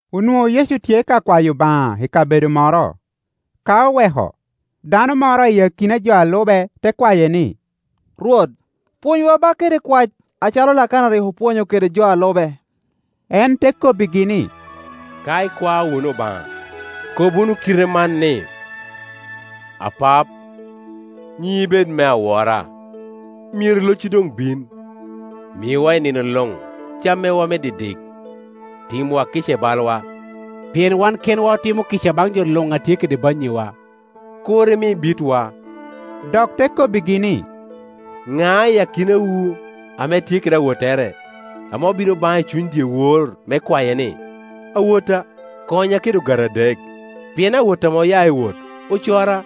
Onwoŋo Yecu tye ka kwayo Obaŋa i kabedo moro; ka doŋ oweko, dano moro i akina jo a lube te kwaye ni, “Rwot, pwonywa ba kede kwac, acalo Lakana rik opwonyo kede jo a lube.” En te kobbigi ni, “Ka ikwao wunu Obaŋa, kob wunu kite man ni, ‘Apap, nyiŋi bed me awora, Myero locci doŋ bin, Miwa i nino luŋ cam mewa me didik, Timwa kica i balwa, pien wan kenwa otimo kica baŋ jo luŋ a tye kede bannyiwa. Kur imi bitwa.’” Dok te kobbigi ni, “Ŋa i akinawu ame tye kede awottere, ame obino baŋe i cuny dyewor me kwaye ni, ‘Awotta, konya kede ogati adek; pien awotta ame oya i wot ocora,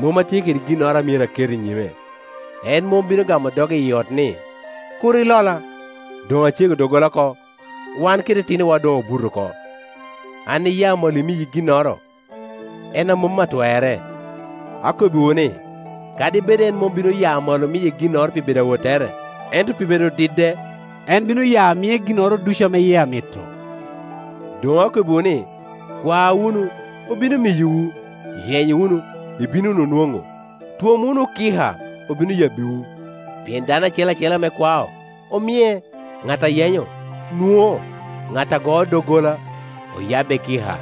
mom atye kede ginnoro a myero aket i nyime?’ En mom bino gamo doge iyi ot ni, ‘Kur ilola; doŋ acego doggola oko, wan kede itinowa doŋ obuto oko, an iya malo miyi ginnoro, en a mom atwerre.’ Akobbiwu ni, kadi bed en mom bino ya malo miye ginnoro pi bedo awottere, ento pi bedo dide, en bino ya mie ginnoro ducu ame yie amito. Doŋ akobbiwu ni: Kwa wunu, obino miyowu; yeny wunu, ibino wunu nwoŋo; twom wunu kika, obino yabbiwu. Pien dano acel acel ame kwao, omie; ŋat a yenyo, nwoŋo; ŋat a goo doggola, oyabbe kika.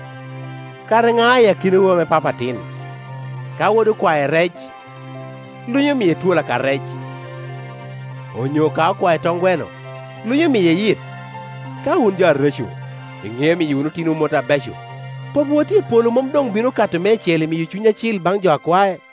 Kara ŋa i akinawu ame papa atin, ka wode okwae rec, lunyo miye twol aka rec? Onyo ka okwae toŋ gweno, lunyo miye yit? Ka wun jo areco, iŋeo miyo otinowu mot abeco, Papawu a tye i polo mom doŋ bino ka to meicel imiyo Cuny Acil baŋ jo a kwae?”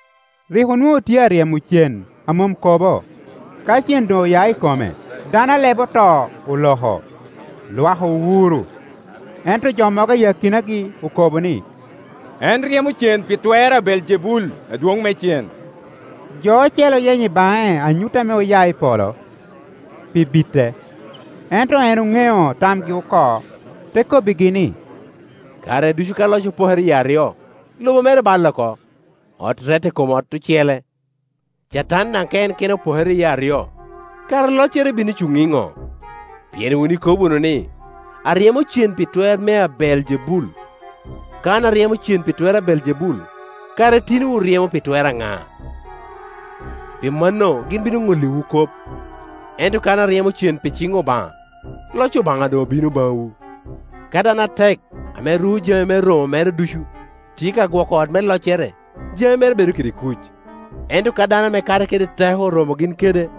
Rik onwoŋo tye aryemo cen a mom kobo; ka cen doŋ oya i kome, dano a lebe oto oloko, lwak owuro. Ento jo mogo i akinagi okobo ni, “En ryemo cen pi twer a Beeljebul, adwoŋ me cen.” Jo ocele oyenyo i baŋe anyut ame oya i polo, pi bite. Ento en oŋeo tamgi oko, te kobbigi ni, “Kare ducu ka loc opokere yie aryo, lobo mere balle oko, ot rette i kom ot ocele. Catan daŋ ka en kene opokere yie aryo, kara loccere bino cuŋ iŋo? Pien wun ikobo wunu ni, aryemo cen pi twer mea Beeljebul. Ka an aryemo cen pi twer a Beeljebul, kara itinowu ryemo pi twer aŋa? Pi mano gin bino ŋolliwu kop. Ento ka an aryemo cen pi ciŋ Obaŋa, loc Obaŋa doŋ obino baŋwu. Ka dano atek, ame ruko jami me romo mere ducu, tye ka gwoko ot me loccere, jami mere bedo kede kuc; ento ka dano ame ka te kede teko oromo gin kede,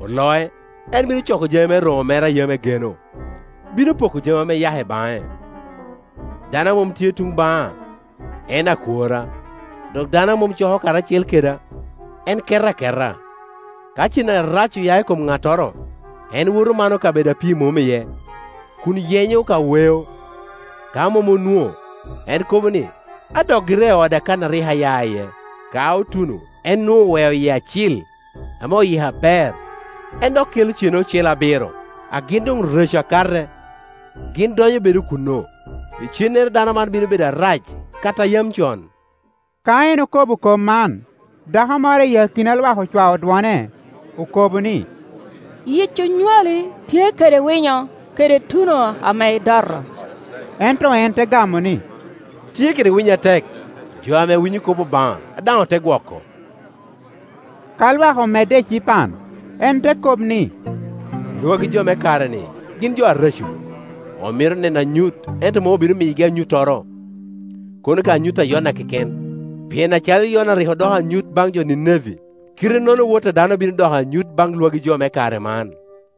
oloc, en bino coko jami me romo mere a yam egeno, bino poko jami ame eyako i baŋe. Dano a mom tye tun baŋa en akworra, dok dano a mom coko karacel keda, en keto aketa. “Ka cen arac oya i kom ŋattoro, en woto mano kabedo a pii mom iye kun yenyo ka weo; ka mom onwoŋo, en kobo ni, ‘Adok gira i oda kan a rik aya iye.’ Ka otuno, en nwoŋo oweo yie acil, ame oyiko aber. En dok kelo cen ocele abiro a gin doŋ reco akate, gin donyo bedo kuno; icennere dano man bino bedo arac kato a yam con.” Ka en okobo kop man, dako moro i akina lwak ocwao dwone, okobo ni, “Yic onywali tye kede winyo, kede tuno ame idoto!” Ento en te gamo ni, “Tye kede winyo atek, jo ame winyo kop Obaŋa, a daŋ ote gwoko.” Ka lwak omedde ecipan, en te kop ni, “Lwagi jo me kare-ni gin jo areco; omito neno anyut, ento mom obino miyogi anyuttoro, kono ka anyut a Yona keken. Pien acalo Yona rik odoko anyut baŋ jo Nineve, kite-nono wot a dano bino doko anyut baŋ lwagi jo me kare man.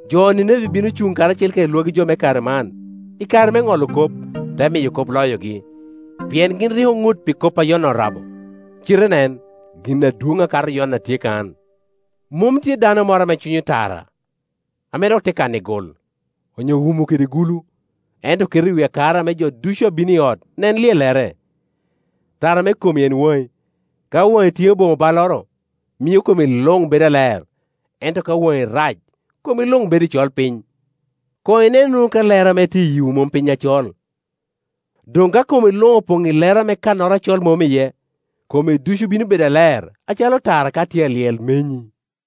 Jo Nineve bino cuŋ karacel kede lwagi jo me kare man, i kare me ŋolo kop, te miyo kop loyogi; pien gin rik oŋut pi kop a Yona orabo, cite nen, gin adwoŋ akato Yona tye, kan. “Mom tye dano moro ame cwinyo tara ame dok te kano i gul, onyo wumo kede gulu, ento keto i wi akara, me jo ducu a bino i ot nen lyellere. Tara me komi en waŋi; ka waŋi tye boŋo balloro, mio komi luŋ bedo aler. Ento ka waŋi rac, komi luŋ bedo i colpiny. Koŋ inen wunu ka lero ame tye iyii mom piny acol. Doŋ ka komi luŋ opoŋ i lero ame kannoro acol mom iye, komi ducu bino bedo aler, acalo tara ka tye a lyel, menyi.”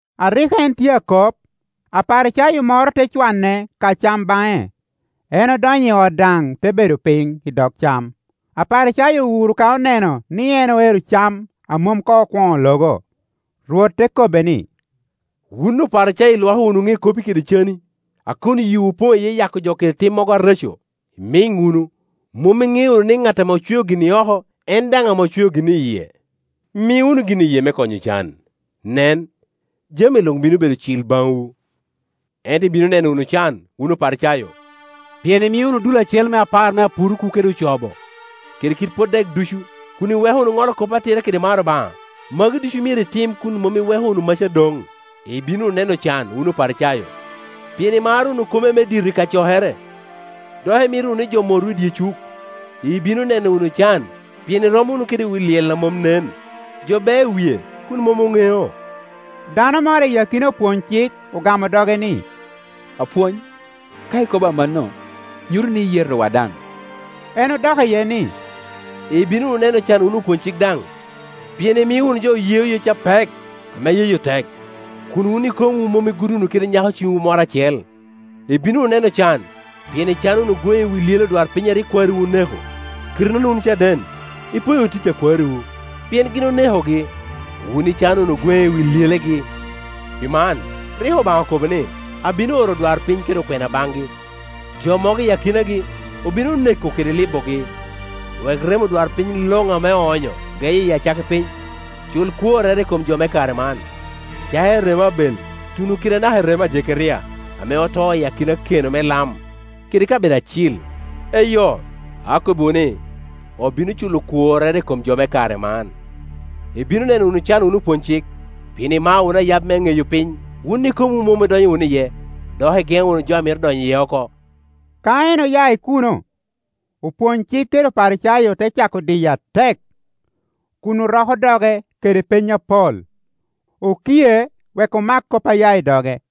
A rik en tye akop, Aparicayo moro te cwane ka cam baŋe; en odonyo i ot daŋ te bedo piny i dog cam. Aparicayo owuro ka oneno ni en oero cam a mom koŋ okwoŋo logo. Rwot te kobbe ni, “Wun Oparicayo ilwoko wunu ŋe kopo kede cani, a kun yiwu opoŋ iye yako jo kede timmogo areco. Imiŋ wunu, mom iŋeo wunu ni ŋat ame ocweo gin i oko en daŋ ame ocweo gin i yie? Mi wunu gin i yie me konyo ocan; nen, jami luŋ bino bedo cil baŋwu. “Ento ibino neno wunu can, wun Oparicayo! Pien imio wunu dul acel me apar me apuruku kede ocobo kede kit pot dek ducu, kun iweko wunu Ŋolo kop atira kede maro Obaŋa; magi ducu myero itim wunu, kun mom iweko wunu maca doŋ. Ibino wunu neno can wun Oparicayo! Pien imaro wunu kome me dito i kacokere, dok imito wunu ni jo motwu i dye cuk. Ibino neno wunu can! Pien irom wunu kede wi lyel a mom nen; jo beo i wie kun mom oŋeo.” Dano moro i akina opwony-cik ogamo doge ni, “Apwony, ka ikobo amanno, nyuto ni iyetowa daŋ.” En odok iye ni, “Ibino wunu neno can wun opwony-cik daŋ! Pien imio wunu jo yeyo yec apek, ame yeyo tek, kun wun ikokomwu mom igudo wunu kede nyako ciŋwu moro acel. Ibino wunu neno can! Pien icano wunu gweŋe i wi lyele odwarpiny a rik kwariwu oneko. Kite-nono wun caden, ipwoyo wunu tic a kwariwu, pien gin onekogi, wun icano wunu gweŋe i wi lyelegi. Pi man, ryeko Obaŋa okobo ni, ‘Abino oro odwarpiny kede okwena baŋgi, jo mogo i akinagi obino neko kede libogi,’ wek remo odwarpiny luŋ ame oonyo geye i acakki piny, cul kworrere i kom jo me kare man, Tek. 24.20-21cakere i remo Abel tuno kede anaka i remo a Jekeria ame oto i akina keno me lam kede kabedo acil. Eyo, akobbiwu ni, obino culo kworrere i kom jo me kare man. Ibino neno wunu can wun opwonycik! Pien imao wunu ayab me ŋeyo piny; wun ikomwu mom idonyo wunu iye, dok igeŋo wunu jo a mito donyo iye oko,” Ka en oya i kuno, opwony-cik kede Oparicayo te cako diye atek, kun oroko doge kede peny apol, okie wek omak kop a ya i doge.